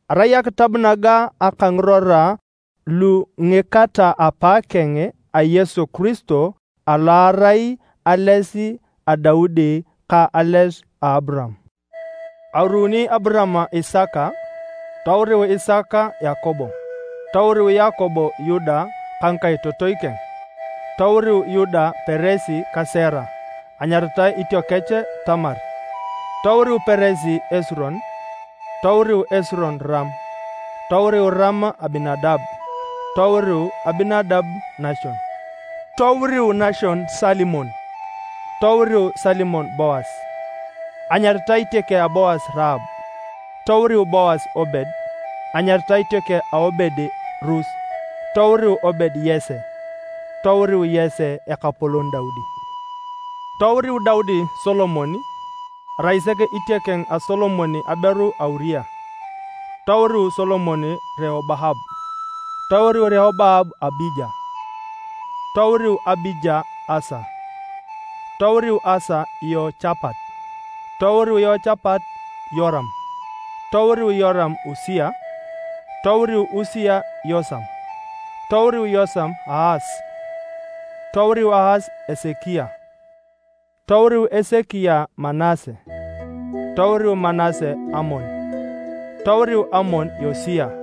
Erai akitab naga aka ngirora lu ngika ta apaakeng a Yesu Kiristo alo erai ales a Daudi ka ales a Aburaam. Auruni Aburaam Isaka, touriu Isaka Yakobo, touriu Yakobo Yuda ka ngikaitotoi keng. Touriu Yuda Peres ka Sera (anyaritae itiokech Tamar). Touriu Peres Esiron. Touriu Esiron Ram. Touriu Ram Aminadab. Touriu Aminadab Nachon. Touriu Nachon Salimon. Touriu Salimon Boas (anyaritae itiokeng a Boas Raab). Touriu Boas Obed (anyaritae itiokeng a Obed Rus). Touriu Obed Yese. Touriu Yese ekapolon Daudi. Touriu Daudi Solomon (arai sek itiokeng a Solomon aberu a Uria). Touriu Solomon Reoboam. Touriu Reoboam Abija. Touriu Abija Asa. Touriu Asa Yeochapat. Touriu Yeochapat Yoram. Touriu Yoram Usia. Touriu Usia Yosam. Touriu Yosam Aas. Touriu Aas Esekia. Touriu Esekia Manase. Touriu Manase Amon. Touriu Amon Yosia.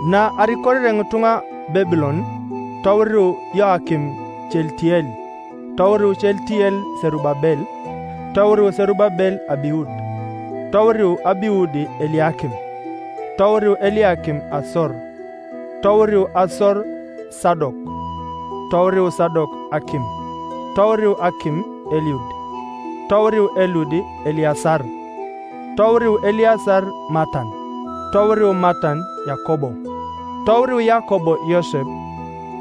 Na arikorere ngitunga Babilon, touriu Yeoyakin Chealitiel. Touriu Chealitel Serubabel. Touriu Serubabel Abiud. Touriu Abiud Eliakim. Touriu Eliakim Asor. Touriu Asor Sadok. Touriu Sadok Akim. Touriu Akim Eliud. Touriu Eliud Eleasar. Touriu Eleasar Matan. Touriu Matan Yakobo. Touriu Yakobo Yosep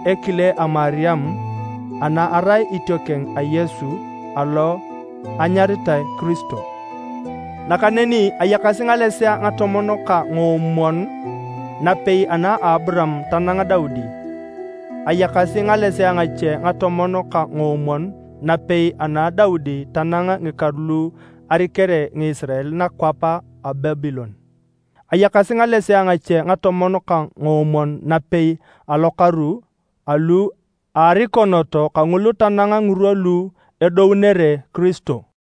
ekile a Mariam ana arai itiokeng a Yesu alo enyaritae Kiristo. Nakaneni ayakasi ngalesea ngatomon ka ngoomwon napei ana Aburaam tanang Daudi. Ayakasi ngalesea ngache ngatomon ka ngoomwon napei ana Daudi tanang ngikaru lu arikere Ngisirael nakwap a Babilon. Ayakasi ngalesea ngache ngatomon ka ngoomwon napei alokaru alu arikonot kangulu tanang ngirwa lu edounere Kiristo.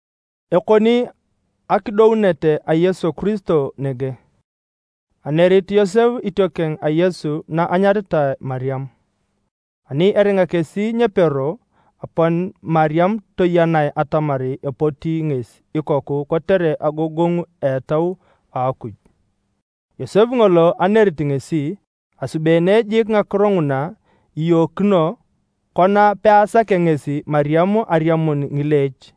Ekoni akidounet a Yesu Kiristo nege. Anerit Yosep itiokeng a Yesu na enyaritae Mariam. Ani eringa kesi nyepero, apon Mariam toyenae atamar epoti ngesi ikoku kotere agogongu a Etau a Akuj. Yosep ngolo anerit ngesi asubeene jiik ngakiro nguna iyookino. Kona peasakea ngesi Mariam eriamuni ngileech,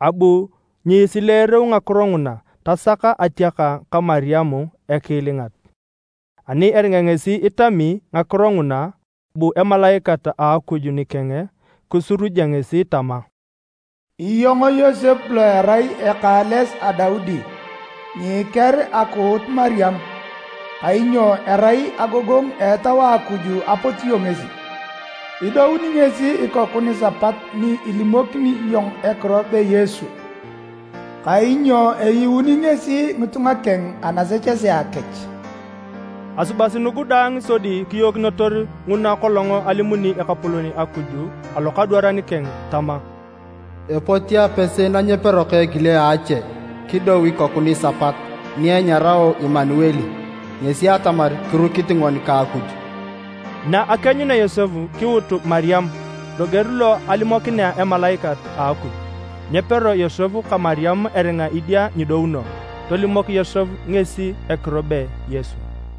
abu nyisileereu ngakiro nguna, tasak atiaka ka Mariam ekiilingat. Ani eringa ngesi itami ngakiro nguna, bu Emalaikat a Akuj nikeng kisuruja ngesi tama, “Iyong Yosep lo irai eka a ales a Daudi, nyiiker akuut Mariam, kainyo erai agogongu a Etau a Akuj apotio ngesi. Idouni ngesi ikoku nisapat ni ilimokini iyong ekiro be Yesu, kainyo eyuuni ngesi ngitunga keng anasechesea kech.” Asubasi nugu daang sodi kiyookinotor nguna kolong alimuni Ekapolon Akuj alokadwaran keng tama: “Epoti apese na nyepero ka ekile a ache kidou ikoku nisapat, ni enyarao Imanuel” (ngesi atamar, “Kirukit ngoni ka Akuj”). Na akienyunea Yosep kiuut Mariam loger lo alimokinea Emalaikat a Akuj. Nyepero Yosep ka Mariam eringa idia nyidouno. Tolimok Yosep ngesi ekiro be Yesu.